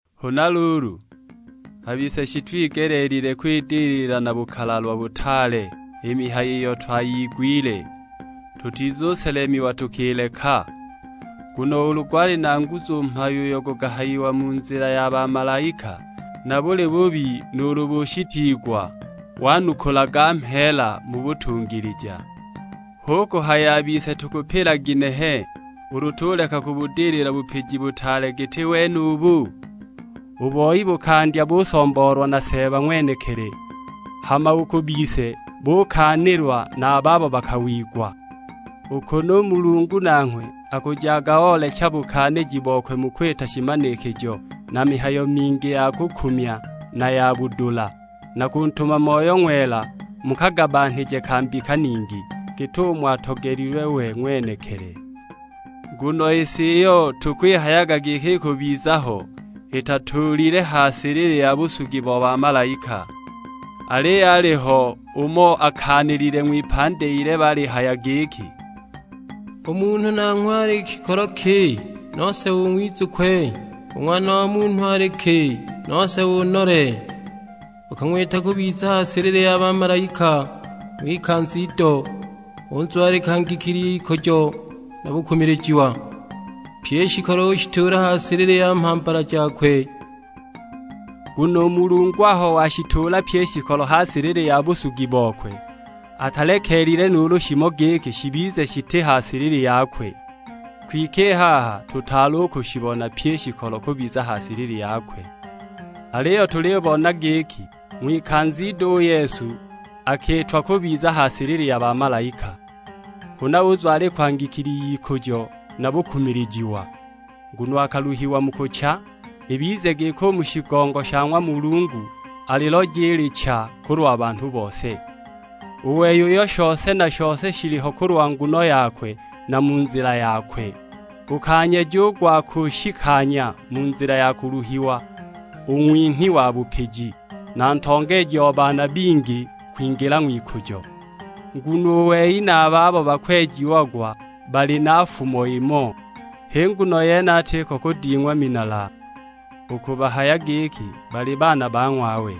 Huna luulu, a bise shitwigelile kwidilila na bukalalwa butaale i mihayo iyo twayigwile, tutizuselemiwa tukileka. Nguno ulu gwali na nguzu u mhayo uyo gukahayiwa mu nzila ya bamalaika, na buli bubi nuulu bushitiigwa wanukulaga mheela mu butungilija; hu kuhaya a bise tukupila ginehe, ulu tuleka kubudilila bupiji butaale giti wenubu? U boi bukandya busomboolwa na Seeba ng'wenekili, hama u ku bise bukaanilwa na a babo bakang'wigwa. U kunu u Mulungu nanghwe akujaga oolecha bukaaniji bokwe mu kwita shimanikijo na mihayo mingi ya kukumya na ya budula, na kuntuma Moyo Ng'wela mu kagabanhije ka mbika ningi, git'umo atogelilwe we ng'wenekili. Nguno i si iyo tukwihayaga giki ikubiza ho, atituulile ha silili ya busugi bo bamalaika. Aliyo aliho umo akaanilile ng'wipandi ilebe alihaya giki, "U munhu nanghwe ali shikolo ki, nose ung'wizukwe? U ng'wana wa munhu ali ki, nose unole? Ukang'wita kubiza ha silili ya bamalaika ng'wikanza ido, unzwalika ngikili y'ikujo na bukumilijiwa. Pye i shikolo ushituula ha silili ya mhambala jakwe!" Nguno u Mulungu aho washituula pyi i shikolo ha silili ya busugi bokwe, atalekeelile nuulu shimo giki shibize shiti ha silili yakwe. Kwike i haha tutaali u kushibona pyi i shikolo kubiza ha silili yakwe. Aliyo tulibona giki, ng'wikanza ido u Yesu akiitwa kubiza ha silili ya bamalaika, huna uzwalikwa ngikili y'ikujo na bukumilijiwa; nguno akaluhiwa mu kucha, ibize giki u mu shigongo sha ng'wa Mulungu, aliloje i licha kulwa banhu bose. U wei uyo shose na shose shiliho kulwa nguno yakwe na mu nzila yakwe, gukanyeja u gwa kunshikanya mu nzila ya kuluhiwa u Ng'winhi wa bupiji, na Ntongeeji o baana bingi kwingila ng'wikujo. Nguno u wei na a babo bakwejiagwa bali na fumo imo, h'i nguno yene atiko kuding'wa minala u kubahaya giki bali baana ba ng'wawe.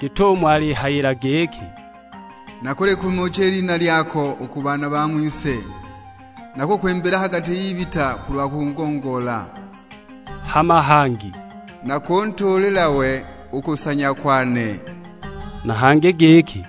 Git'umo alihayila giki, "Nakulikumucha i lina lyako u ku baana ba ng'wise, nakukwimbila ha gati y'ibita kulwa kukugongoola." Hama hangi, "Nakuntuulila we u kusanya kwane;" na hangi giki,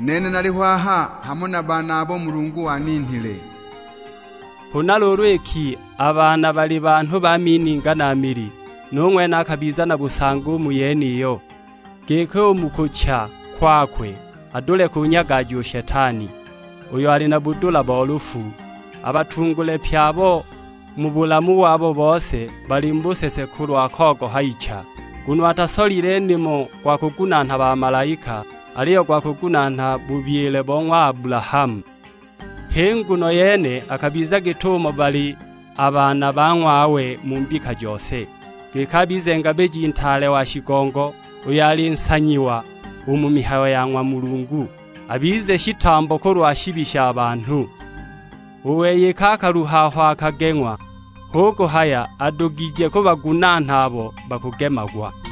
"Nene naliho aha hamo na a baana abo Mulungu waninhile." Huna luulu iki a baana bali banhu ba mininga na mili, nu ng'wene akabiza na busangi u mu yeniyo, giki u mu kucha kwakwe adule kunyagaja u Shetani, uyo ali na budula bo lufu. Abatungule pye abo mu bulamu wabo bose bali mu busese kulwa kogoha icha! Nguno atasolile nimo gwa kugunaana bamalaika, aliyo gwa kugunaana bubyile bo ng'wa Abulahamu. H'i nguno yene akabiza git'umo bali a baana ba ng'wawe mu mbika jose, giki abize Ngabiji Ntaale wa shigongo, uyo ali nsanyiwa u mu mihayo ya ng'wa Mulungu; abize shitambo kulwa shibi sha banhu. U wei iki akaluha aho akageng'wa, hu kuhaya adugije kubagunaana abo bakugemagwa.